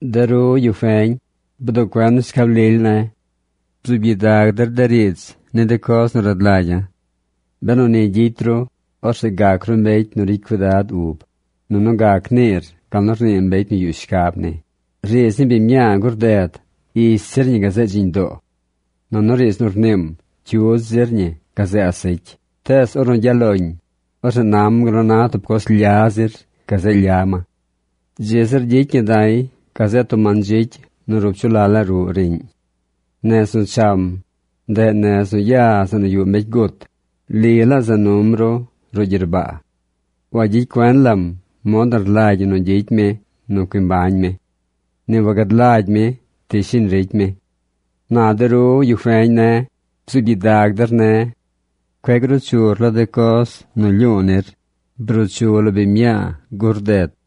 De ru, yu feñ, bduꞌ cuen shcab lily ne̱. Bzuub gyidag der de riidz ni de coz nu rad lagya̱. Benu ni gyicy ru, orzeꞌ gac ru mbecy nu ricy cuidad ub. Nunu gac niir gal nu rnii mbecy nu yuꞌ shcab ni. Riidz ni biñ mñaa gur ded ish zir ñi gazeꞌ dziñ doo. Nunu riidz nu rniim cyudz zir ñi gazeꞌ asecy. Tees ornu gyaꞌ loñ, orzeꞌ nam gal nu na tub coz lya zir gazeꞌ lya ma. Dzi zir gyicy ñi da̱y gazeꞌ tub mandzicy nu rup chu laꞌ laa ruꞌ riꞌñ. Nez nu cham, ndeꞌ nez nu ya zeꞌ nu yuꞌ mbecy gut. Li laa za num ru ruꞌ gyerbaa. Wagyicy cuen lam mod nu rlagy ñi nu gyicy mi nu cui mbañ mi. Ni wagad lagy mi ti shiñ ricy mi. Na de ru, yu feñ ne̱, bzuub gyidag der ne̱. Cueꞌ gruu chur lo de coz nu lyu̱u̱ nir. Bruu chu lo biñ mñaa gur ded.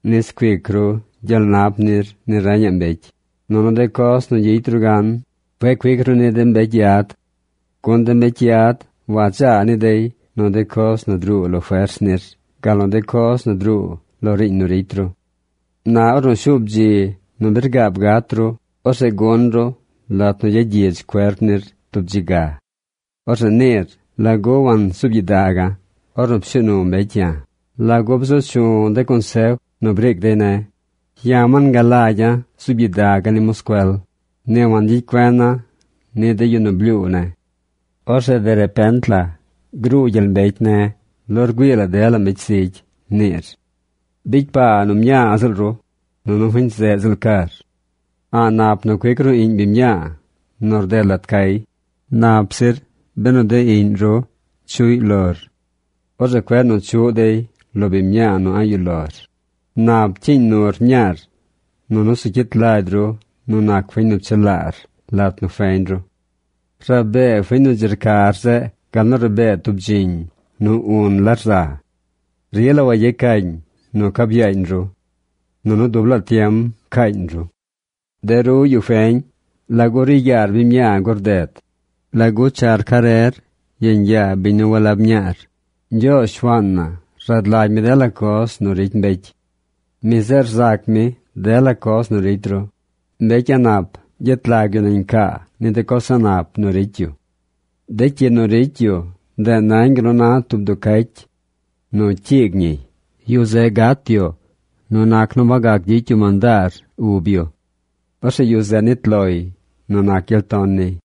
nis cuic ru gyel nap nir ni reñaꞌ mbecy, nunu de coz nu gyicy ru gan cueꞌ cuic ru ni de mbecy yad. Gun de mbecy yad wadzaa ni dey nu de coz nu druu lo fers nir gal nu de coz nu druu lo riiñ nu ricy ru. Na ornu shuub dzi nu bi rgaab gat ru, orzeꞌ gun ru lat nu gyagyidz cuerp nir tub dzi ga. Orzeꞌ niir: “¿Lagu wansuub gyidaga̱ ornu pshuu nu mbecy ya̱? ¿Lagu bzu chu̱ de consef nu briic dey ne̱? Ya̱ wangalagya̱ zuub gyidaga̱ ni moscuel. Ni wangyicy cuena̱ ni de yu nu blyuu ne̱. Orzeꞌ de repent la bruu gyel mbecy ne̱ lo rgüii dela mbecy zigy”, niir. Bicy paa nu mñaa ziꞌl ru, nunu fiñ zeꞌ ziꞌl car. A̱ꞌ nap nu cuic ru iꞌñ biñ mñaa nu rded lat cay. Nap zir benu de iꞌñ ru chuꞌy lor. Orzeꞌ cueꞌ nu chuꞌ dey lo biñ mñaa nu a̱ꞌ yuꞌ lor. Nap cyiiñ nur mñaar, nunu zu cyit lagy ru nu nac fiñ nu pchelaar lat nu feñ ru. Rabee fiñ nu dzi rcar zeꞌ gal nu rabee tub dziñ nu un la rza. Rila wayecañ nu cab yaañ ru. Nunu dub laa tiem caañ ru. De ru, yu feñ, ¿lagu ri yaar biñ mñaa gur ded? ¿Lagu char carer yeñ yaa biñ nu walab mñaar? Ñgyoozh, Shuaan na, rad lagy mi dela coz nu ricy mbecy. Mi zeꞌ rzac mi dela coz nu ricy ru. Mbecy a̱ꞌ nap gyet lag yu nañ caa ni de coz a̱ꞌ nap nu ricy yu. De cyi nu ricy yu ndeꞌ nañ gal nu na tub duu cacy nu cyiig ñiy. Yu zeꞌ gat yu nu nac nu wagac gyicy yu mandaar ub yu. Orzeꞌ yu zeꞌ nit loy nu nac gyel ton niy.